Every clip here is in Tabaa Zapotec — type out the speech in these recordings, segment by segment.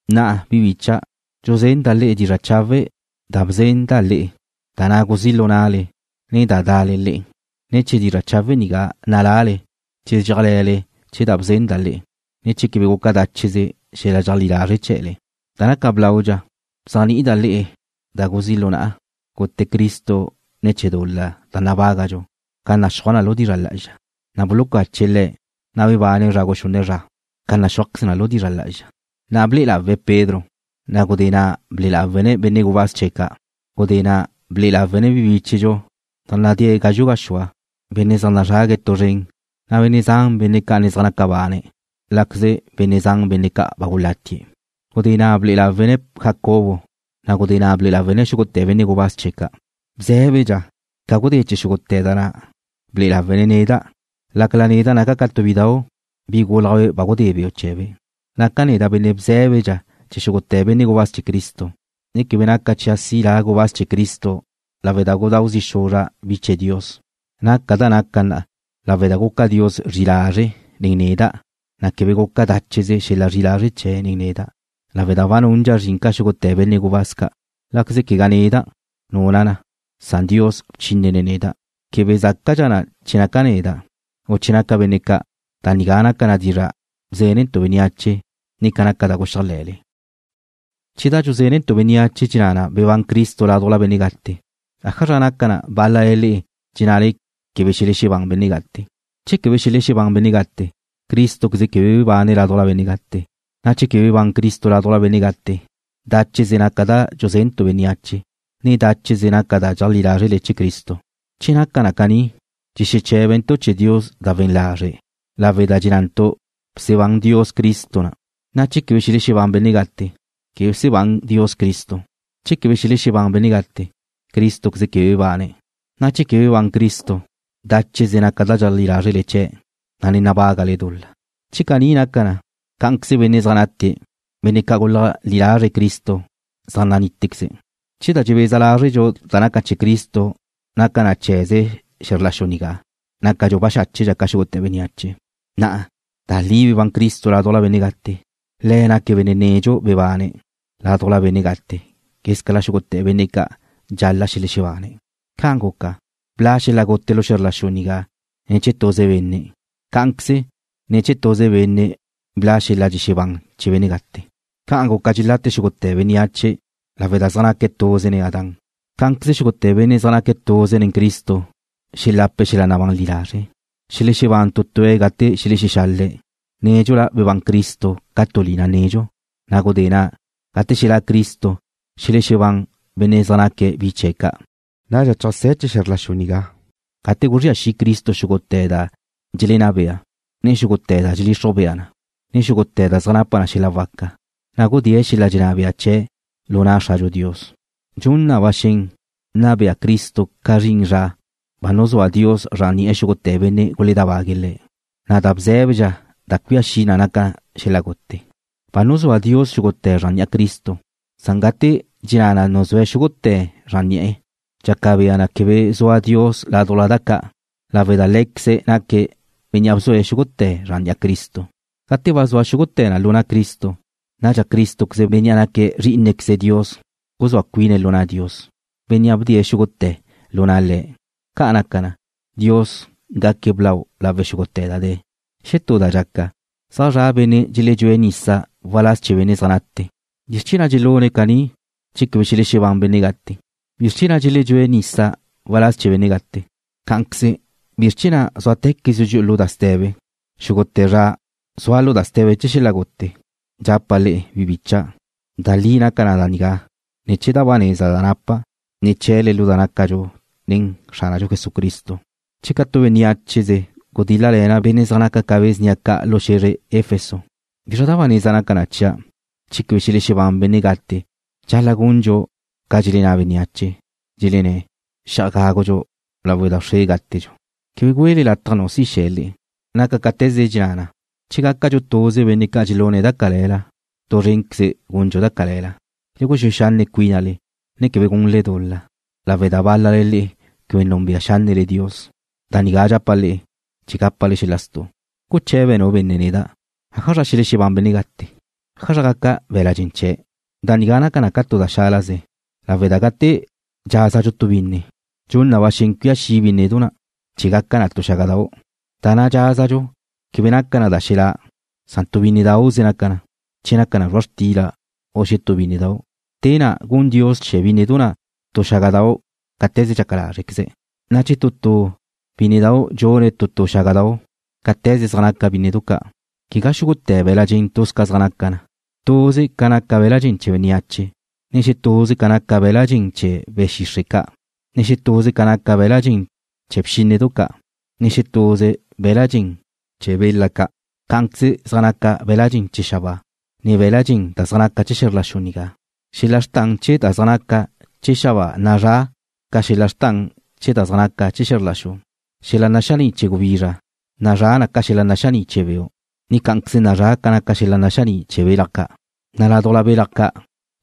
Na'a, bi bícha'dau', dxuzenda' le'e dizra' chawe' da ba bzenda' le'e, da na' guzí' lu na'le, ne da da'le le'e. Ne̱ chee̱ dizra' chawe' nigá nalale che dxéajle̱le chee̱ da bzenda' le'e, ne che quebe guca dácheze xel-la dxeajlí lazre' chee̱le. Da naca blaudxa, bzéajni'ida' le'e da guzí' lu na'a, gute Cristo ne̱ chee̱ dul-la da nabágadxu ca naxúaj na lu dizra' lá'azxa, na' bulucache̱' Le̱', na' bebane̱' zra guxunne' zra ca naxúajqueze na lu dizra' lá'azxa, na' ble'e lawe̱' lau Pedro, na' gudé na' ble'e lawe̱' lau benne' gubáz chee̱' ca'. Gudé na' ble'e lawe̱' lau bi bíchedxu zaj nácadxe̱' ca gazxu' gaxúa benne' zaj nazrague̱' tu zren, na' benne' zan, benne' ca' ne zaj naca bane̱', láqueze benne' zan, benne' ca' ba gulatie̱'. Gudé na' ble'e lawe̱' lau Jacobo, na' gudé na' ble'e lawe̱' lau xúgute̱ benne' gubáz chee̱' ca'. Bzé̱bedxa, ca gudé chee̱ xúgute̱ da na', ble'e lawe̱' lawa' neda', lácala neda' naca' ca tu bidau', bi gúlajbe' ba gudé beu' chee̱be'. Neda' naca' benne' bzé̱bedxa chee̱ xúgute̱ benne' gubáz chee̱ Cristo, ne quebe naca chia' si' la' gubáz chee̱ Cristo lawe' da gudáu zi' xuzra' bi ca' chee̱ Dios. Naca' da naca' lawe' da guca Dios zri'i lazre' nen neda', na' quebe guca dácheze xel-la zri'i lazre' chee̱' nen neda', lawe' da ba nundxa' zrin ca xúgute̱ benne' gubáz ca', láqueze quegá neda' nuna' na, san Dios bchínene̱' neda'. Quebe zácadxa na che naca neda', u che naca benne' ca', da nigá naca na dizra' bzénentu' bénneache, ne naca na da guxéajle̱le. Che da dxuzénentu' bénneache dxenná na bebán Cristo ládujla benne' gate, ¿ájazra naca na bál-lale le'e dxennale quebe xelexebán benne' gate? Che quebe xelexebán benne' gate, Crístoqueze quebe bebane̱' ládujla benne' gate, na' che quebe bebán Cristo ládujla benne' gate, dácheze naca da dxuzénentu' bénneache, ne dácheze naca da dxeajlí lázrele chee̱ Cristo. Che caní naca na dxexeché̱bentu' chee̱ Dios da we̱n lazre' lawe' da dxennantu' bsebán Dios Cristo, na' che quebe xelexebán benne' gate, quebe bsebán Dios Cristo. Che quebe xelexebán benne' gate, Crístoqueze quebe bebane̱', na' che quebe bebán Cristo, dácheze naca da dxeajlí lázrele chee̱', na' ne nabágale dul-la. Che caní naca na, cá'anqueze benne' zaj nate, benne' ca' guleajlí lazre̱' Cristo zaj nanítequeze̱'. Che da dxebeza lázrentu' da naca chee̱ Cristo naca na chee̱ze xe̱zr la xu nigá, nácadxu baxáchedxa ca xúgute̱ bénneache. Na'a da li bebán Cristo ládujla benne' gate. Le̱' naque̱' benne' nedxu bebane̱' ládujla benne' gate quézcala xúgute̱ benne' ca' dxal-la' xelexebane̱'. Ca guca, bla' xel-la gute lu xe̱zr la xu nigá ne̱ chee̱ tuze benne', cá'anqueze ne̱ chee̱ tuze benne' bla' xel-la dxexebán chee̱ benne' gate. Ca naca dxelate xúgute̱ bénneache lawe' da zaj naque̱' tuze nen Adán, cá'anqueze xúgute̱ benne' zaj naca tuze nen Cristo xelape̱' xel-la nabán li lazre'. Xelexebán tu tue̱' gate xelexexale̱', nédxula bebán Cristo ca tu lina nedxu, na' gudé na', gate xelá' Cristo xelexebán benne' zaj naque̱' bi chee̱' ca'. Nadxa cheajsé̱ chee̱ xe̱zr la xu nigá gate guzría xi' Cristo xúgute̱ da dxelenná bea, ne xúgute̱ da dxelixruj bea na, ne xúgute̱ da zaj napa xel-la waca, na' gudée̱' xel-la dxenná bea chee̱' lu na' Xradxu Dios. Dxun na ba xen nna bea Cristo ca zrin zra ba nuzúa Dios zran ni'e̱ xúgute̱ benne' guledábague̱' Le̱', na' da bzé̱bedxa da cuía xi' naca na xel-la gute. Ba nuzúa Dios xúgute̱ zran ni'a Cristo, san gate dxenná na nuzúe̱' xúgute̱ zran ni'e̱, dxaca bea na quebe zua Dios ládujla da ca', lawe' da Lé̱queze̱' naque̱' Bénnea' bzue̱' xúgute̱ zran ni'a Cristo. Gate ba zua xúgute̱ lu na' Cristo, nadxa Crístoqueze, Bénnea' naque̱' Zrí'inequeze Dios guzúa cuine̱' lu na' Dios, Bénnea' bdee̱' xúgute̱ lu na' Le̱'. Ca' naca na, Dios gaque̱' blau lawe' xúgute̱ da de̱. Xetú da dxaca, zaj zua benne' dxeledxúe̱' nisa waláz chee̱ benne' zaj nate. ¿Bizr chee̱ na' dxelune̱' caní che quebe xelexebán benne' gate? ¿Bizr chee̱ na' dxeledxúe̱' nisa waláz chee̱ benne' gate? Cá'anqueze, ¿bizr chee̱ na' zúatequezdxu dxi'u lu da ste̱be? Xúgute̱ zra zua' lu da ste̱be chee̱ xel-la gute. Dxapa' le'e, bi bicha', da li naca da nigá ne̱ chee̱ da ba neza da napa' ne̱ chee̱le lu da nácadxu nen Xránadxu Jesucristo. Che ca tu bénneacheze gudíl-lale̱na' benne' zaj naca ca be̱ snia ca' lu xe̱zre Efeso ¿bizra da ba neza naca na chia'? Che quebe xelexebán benne' gate dxal-la' gundxu ca dxelenná bénneache, dxelenné̱': “Xi'aj gágudxu lawe' da wxre gátedxu.” Quebe güele lataj nu si xe̱ le'e. Naca cáte̱ze dxenná na: Che gácadxu tuze benne' ca' dxelune̱' da cale̱la, tu zrénqueze gundxu da cale̱la. Le guxúe xanne' cuínale, ne quebe gunle dul-la, lawe' da bál-lale le'e quebe núnbea xánnele Dios. Da nigá dxapa' le'e chee̱ gápale xel-la stu'. Guche̱be nu benne' neda': Ájazra xelexebán benne' gate? ¿Ájazra gaca be̱la' dxen chee̱'? Da nigá naca na tu da xálaze, lawe' da gate dxázadxu tu binne, dxun na ba xen cuía xi' bínnedu na' chee̱ gaca na tu xágadau'. Da na' dxázadxu quebe naca na da xelá', san tu bínnedauze naca na, che naca na zrua' xtila u xetú bínnedau'. Te na' gun Dios chee̱ bínnedu na' tu xágadau' cáte̱ze dxaca lázrequeze̱', na' chee̱ tu tu bínnedau' dxune̱' tu tu xágadau' cáte̱ze zaj naca bínnedu ca'. Quegá xúgute̱ be̱la' dxen tuz ca zaj naca na. Tuze ca naca be̱la' dxen chee̱ bénneache, ne xetuze ca naca be̱la' dxen chee̱ be̱ xixre' ca', na' xetuze ca naca be̱la' dxen chee̱ bxínnedu ca', ne xetuze be̱la' dxen chee̱ bela ca'. Cá'anqueze zaj naca be̱la' dxen chee̱ xabáa, ne be̱la' dxen da zaj naca na chee̱ xe̱zr la xu nigá. Xel-la xrtan chee̱ da zaj naca chee̱ xabáa nazrá' ca xel-la xrtan chee̱ da zaj naca chee̱ xe̱zr la xu. Xel-la naxaní' chee̱ gubizra nazrá' ca xel-la naxaní' chee̱ beu', ne cá'anqueze nazrá' ca xel-la naxaní' chee̱ belaj ca', na' ládujla belaj ca',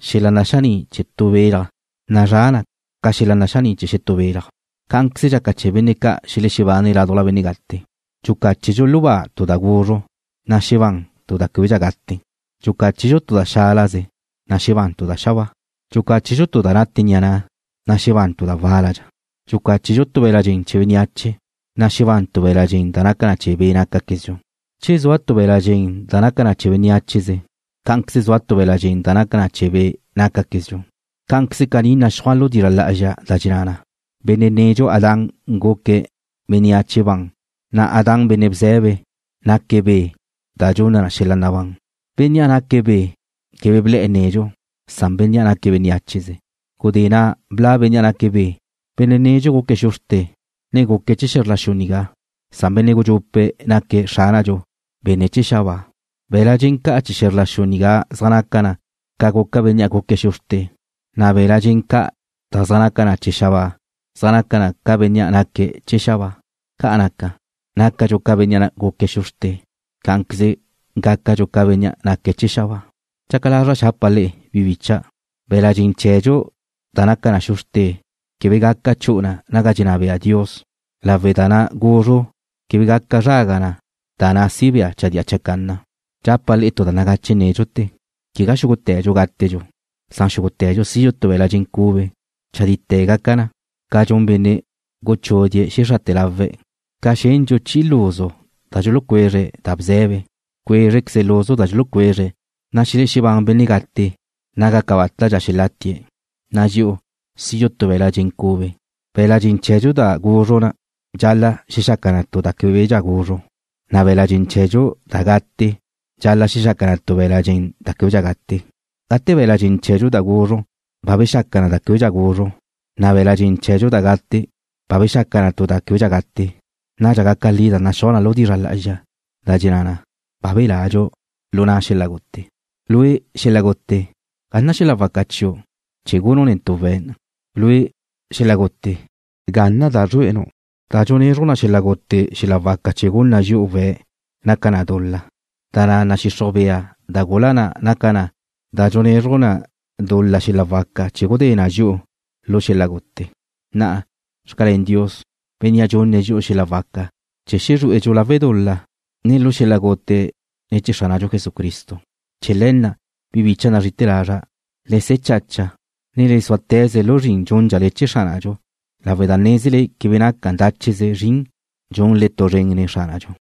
xel-la naxaní' chee̱ tu belaj nazrá' ca xel-la naxaní' chee̱ xetú belaj. Cá'anqueze dxaca chee̱ benne' ca' xelexebane̱' ládujla benne' gate. Dxucáchedxu lu ba tu da guzru', na' xebán tu da québedxa gate. Dxucáchedxu tu da xálaze, na' xebán tu da xabáa. Dxucáchedxu tu da nate ni'a na', na' xebán tu da wál-lale̱'e̱. Dxucáchedxu tu be̱la' dxen chee̱ beniácheze, na' xebán tu be̱la' dxen da naca na chee̱ be' nácaquezdxu. Che zua tu be̱la' dxen da naca na bénneacheze, cá'anqueze zua tu be̱la' dxen da naca na chee̱ be' nácaquezdxu. Cá'anqueze caní naxúaj lu dizra' lá'azxa da dxenná na: Benne' nedxu Adán guque̱' bénneache ban, na' Adán, benne' bze̱be, naque̱' Be' da dxunna xel-la nabán. Bénnea' naque̱' Be' quebe ble̱'e̱ nedxu, san bénnea' naque̱' bénneacheze. Gudé na' bla' Bénnea' naque̱' Be'. Benne' nedxu guque̱' xu bxrte, ne guque̱' chee̱ xe̱zr la xu nigá, na' Benne' gudxupe' naque̱' Xránadxu, Benne' chee̱ xabáa. Be̱la' dxen ca' chee̱ xe̱zr la xu nigá zaj naca na ca guca bénnea' guque̱' xu bxrte, na' be̱la' dxen ca' da zaj naca na chee̱ xabáa zaj naca na ca Bénnea' naque̱' chee̱ xabáa. Ca naca, nácadxu ca bénnea' guque̱' xu bxrte, cá'anqueze gácadxu ca Bénnea' naque̱' chee̱ xabáa. Dxaca lazra' xapa' le'e, bi bícha'dau', be̱la' dxen chee̱dxu da naca na xu bxrte quebe gaca chu'u na naga dxenná bea Dios lawe' da na' guzru quebe gaca zraga na da na' si bea chadía chacanna. Dxapa' le'e tu da nagache nédxute: Quegá xúgute̱dxu gátedxu, san xúgute̱dxu sidxu tu be̱la' dxen cube. Chadite̱ gaca na, ca dxun benne' guchudie̱' xexrate̱ lawe̱', gate xendxu chi'i luzu da dxulucuezre̱' da bze̱be. Cuézrequeze luzu da dxulucuezre̱', na' xelexebán benne' gate naga cabátadxa xelatie̱', na' dxi'u sidxu tu be̱la' dxen cube. Be̱la' dxen chee̱dxu da guzru dxal-la' xexaca na tu da québedxa guzru, na' be̱la' dxen chee̱dxu da gate dxal-la' xexaca na tu be̱la' dxen da québedxa gate. Gate be̱la' dxen chee̱dxu da guzru ba bexaca na da québedxa guzru, ne be̱la' dxen chee̱dxu da gate ba bexaca na tu da québedxa gate, nadxa gaca li da naxúaj na lu dizra' lá'azxa, da dxenná na: Ba beladxu lu na' xel-la gute. Lue', xel-la gute, ¿ga na' xel-la waca chiu' chee̱ gunu' netu' we̱'? Lue', xel-la gute, ¿ga na' da zrué'enu'? Da dxunna xel-la gute xel-la waca chee̱ gun na dxi'u we̱' naca na dul-la, na' da nadxixruj bea da gula na' naca na da dxunna na dul-la xel-la waca chee̱ gudé na dxi'u lu xel-la gute. Na'a, xcalén Dios, Bénnea' dxunne̱' dxi'u xel-la waca chee̱ zrué'edxu lu dul-la, ne lu xel-la gute ne̱ chee̱ Xránadxu Jesucristo. Chee̱ le̱ na', bi bicha' nazri'ite̱ lazra', le se̱ chacha, ne le súate̱ze lu zrin dxúndxale chee̱ Xránadxu lawe' da nézele quebe naca dácheze zrin dxunle tu zren nen Xránadxu.